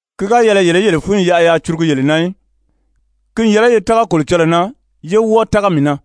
«Ki ga yɛlɛ yele í yele fúnyi yaʔa yaa curugu yele na í. Ki n yɛlɛ ye tága Kolocɔlɔɔ na yé wɔ́ɔ tága mii na.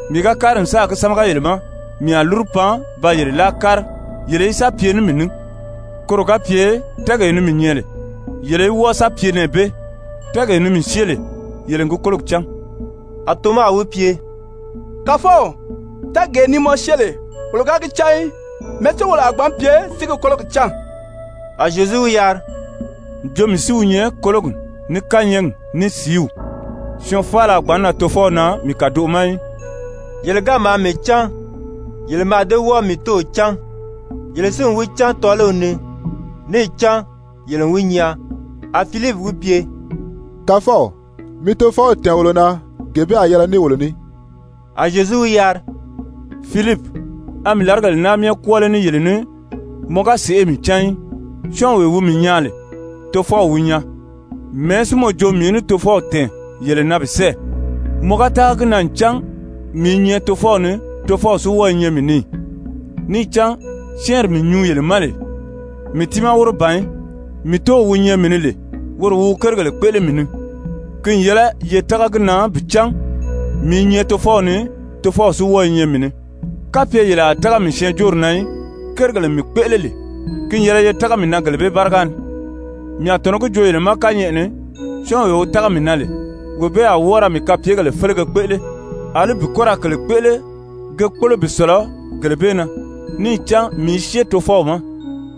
Mii ga kári n sáà gi sámaga yele ma, mii a lúru pan ba yele láa kári yele í sa pye ní mii ní, koro ga pye tɛ́ɛgee ni mii nyɛ lè, yele í wɔ́ɔ sa pye nɛɛ bee. Tɛ́ɛgee ni mii syée lè, yele n gi kólogi cán.» A Toma wi pye: «Kàfɔw, tɛ́ɛgee ni mɔ syée lè, wolo ga gi cán í. Mɛ̀ɛ́ si wolo a gbǎn pye si gi kólogi cán?» A Zyezu wi yari: «Jo mii si wi nyɛ kólogi, ní kányɛɛgi, ní sìíw. Syɔɔn faala a gbǎn nan Tofɔw na mii kàdoʔo ma í.» Yele ga maa mii cán, yele mǎà dée wɔ́ɔ mii Tóow cán. Yele si n wi cán tɔ́ɔliw ni, níì cán yele n wi nyaa. A Filipi wi pye: «Kàfɔw, mi Tofɔw tɛ̀ɛn wolo na, gee bee a yɛlɛ ní wolo ní.» A Zyezu wi yari: «Filipi, a mii làrigèle naa myɛ kwɔ́ɔ lé ní yele ní mɔ ga sèʔê mii cán í? Syɔ́ɔnwee wi mii nyaa lè, Tofɔw wi nyaa. Mɛ̀ɛ́ si mɔ jo mii í ní Tofɔw tɛ̀ɛn yele na bi sɛ́ɛ? Mɔ ga tága gi na ncan mii i nyɛ Tofɔw ni, Tofɔw si wɔ́ɔ i nyɛ mii ni ì? Níì cán syɛ́ɛnri mii nyuu yele ma lè, mii tiimaa wóro ban í. Mii Tóow wi nyɛ mii ni lè, woro wi wi kérigèle kpéʔele mii ni. Ki n yɛlɛ ye tága gi na bi cán mii i nyɛ Tofɔw ni, Tofɔw si wɔ́ɔ i nyɛ mii ni. Kapye yele a tága mii syɛɛnjóori na í, kérigèle mii kpéʔele lè, ki n yɛlɛ ye tága mii na gele bee báriga ni. Mii a tɔ̀nɔ́ gi joo yele ma kányɛʔɛ ni, syɔ́ɔnwee wi tága mii na lè, wee bee a wɔ́ɔ ra mii kapyegèle félege kpéʔele, àlí bi kɔ́ ra kèle kpéʔele ge kpólo bi sɔ̀lɔ gele bee na, níì cán mii i syée Tofɔw ma.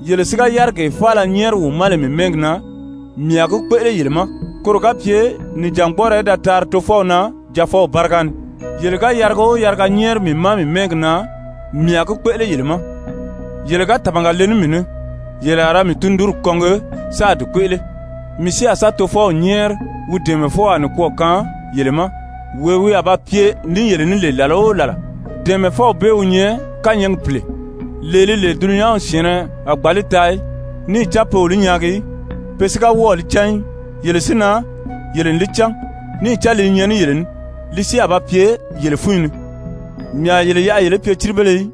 Yele si ga yárigee faala nyɛ́ɛri wi ma lè mii mɛ́ɛgi na, mii a gi kpéʔele yele ma, koro ga pye nìjangbɔɔrɔ í da taari Tofɔw na Jaafɔw báriga ni. Yele ga yariga o yariga nyɛ́ɛri mii ma mii mɛ́ɛgi na, mii a gi kpéʔele yele ma. «Yele ga tàmaga le ní mii ní, yele a ra mii tundunri kɔngi sáā di kpéʔele. Mii si a sa Tofɔw nyɛ́ɛri wi dɛ̀ɛmɛfɔwaa nikwɔɔ kaan yele ma, wee wi a ba pye ní yele ní lè làla o làla. Dɛ̀ɛmɛfɔw bee wi nyɛ kányɛɛgi Pìle, lee li lè dulunyanw syɛ̀ɛnnɛ a gbǎn li taa í, níì cán pe o li nyaagi í, pe si ga wɔ́ɔ̀ li cán í. Yele si na, yele n li cán, níì cán li i nyɛ ní yele ní, li si a ba pye yele fúnyi ni. Mii a yele yaʔa yele í pye círibéle í,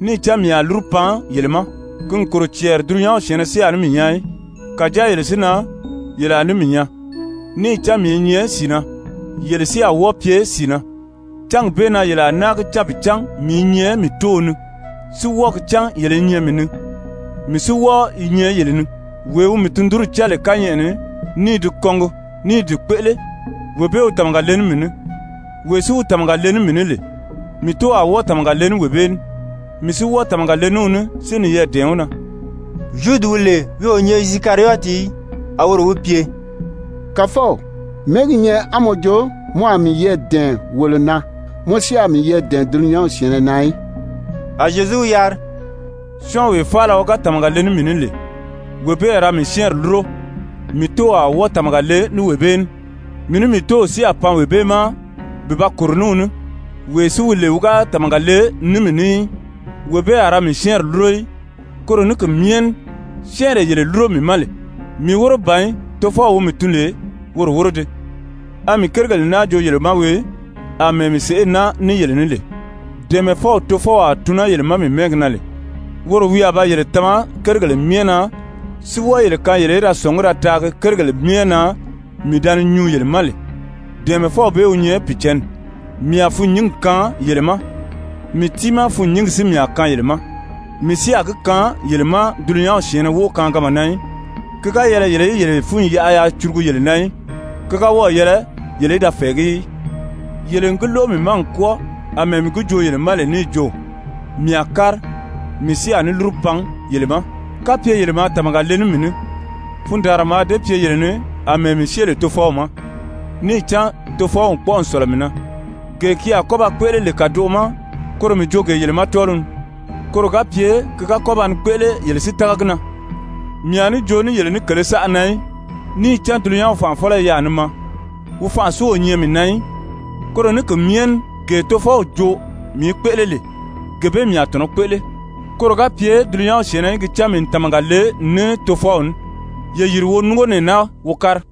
níì cán mii a lúru pan yele ma. Ki n kòro cɛɛri dulunyanw syɛ̀ɛnnɛ si a ní mii nyaa í, kàjáa yele si na, yele a ní mii nyaa, níì cán mii i nyɛ sìi na, yele si a wɔ́ɔ pye sìi na. Cángi bee na yele a náa gi cán bi cán mii i nyɛ mii Tóow ni, si wɔ́ɔ gi cán yele i nyɛ mii ni, mii si wɔ́ɔ i nyɛ yele ni. Wee wi mii tundunri cán lè kányɛʔɛ ni, ní i di kɔngi ní i di kpéʔele, wee bee wi tàmaga le ní mii ní. Wee si wi tàmaga le ní mii ní lè, mii Tóow a wɔ́ɔ tàmaga le ní wee bee ní, mii si wɔ́ɔ tàmaga le ní wi ní, si niyɛɛ dɛ̀ɛn wi na.» Zyudi wi lè wi o nyɛ Isikariyɔti í, a woro wi pye: «Kàfɔw, mɛ̀ɛ́ gi nyɛ á mɔ jo mɔ a miyɛɛ dɛ̀ɛn wolo na, mɔ si a miyɛɛ dɛ̀ɛn dulunyanw syɛ̀ɛnnɛ na í?» A Zyezu wi yari: «Syɔ́ɔnwee faala wi ga tàmaga le ní mii ní lè, wee bee a ra mii syɛ́ɛnri lúro, mii Tóow a wɔ́ɔ tàmaga le ní wee bee ní. Mii ní mii Tóow si a pan wee bee ma bi ba kòro ní wi ní. Wee si wi lè wi ga tàmaga le ní mii ní í, wee bee a ra mii syɛ́ɛnri lúro í. Koro ní ki myɛ ní syɛ́ɛnree yele lúro mii ma lè, mii wóro ban í, tofɔw wi mii tun lè, woro wóro dii. A mii kérigèle naa joo yele ma wii, àmɛɛ mii sèʔé i naa ní yele ní lè. Dɛ̀ɛmɛfɔw Tofɔw a tun naa yele ma mii mɛ́ɛgi na lè, woro wi a ba yele tama kérigèle myɛ na si wɔ́ɔ yele kaan yele í da sɔ̀ngí da taagi kérigèle myɛ na mii da ni nyuu yele ma lè, dɛ̀ɛmɛfɔw bee wi nyɛ Pìicǎnni. Mii a fûnnyingi kaan yele ma, mii tiimaa fûnnyingi si mii a kaan yele ma. Mii si a gi kaan yele ma dulunyanw syɛ̀ɛnnɛ wóʔo kaanganma na í. Ki ga yɛlɛ yele í yele fúnyi yaʔa yaa curugu yele na í, ki ga wɔ́ɔ̀ yɛlɛ yele í da fɛ̀ɛgí í. Yele n gi lóʔo mii ma n kwɔ́ɔ, àmɛɛ mii gi joo yele ma lè níì jo: Mii a kári, mii si a ní lúru pan yele ma. Kapye yele maa tàmaga le ní mii ní, fundaanra mǎà dée pye yele ni àmɛɛ mii syée lè Tofɔw ma, níì cán Tofɔw n kpɔ́ʔɔ n sɔ̀lɔ mii na. Gee ki a kɔ́ ba kpéʔele lè kàdoʔo ma, koro mii joo gee yele ma tɔ́ɔliw ni, koro ga pye ki ga kɔ́ baa kpéʔele yele si tága gi na. Mii a ní joo ní yele ní kèlē saʔa na í, níì cán dulunyanw fànʔafɔlɔ i yaà ni maa. Wi fanʔa si o nyɛ mii na í. Koro ní ki myɛ ní gee Tofɔw joo mii í kpéʔele lè, gee bee mii a tɔ̀nɔ́ kpéʔele, koro ga pye dulunyanw syɛ̀ɛnnɛ í gi cán mii n tàmaga le ní Tofɔw ní. Ye yìri wo núngo nɛɛ naa wo kári.»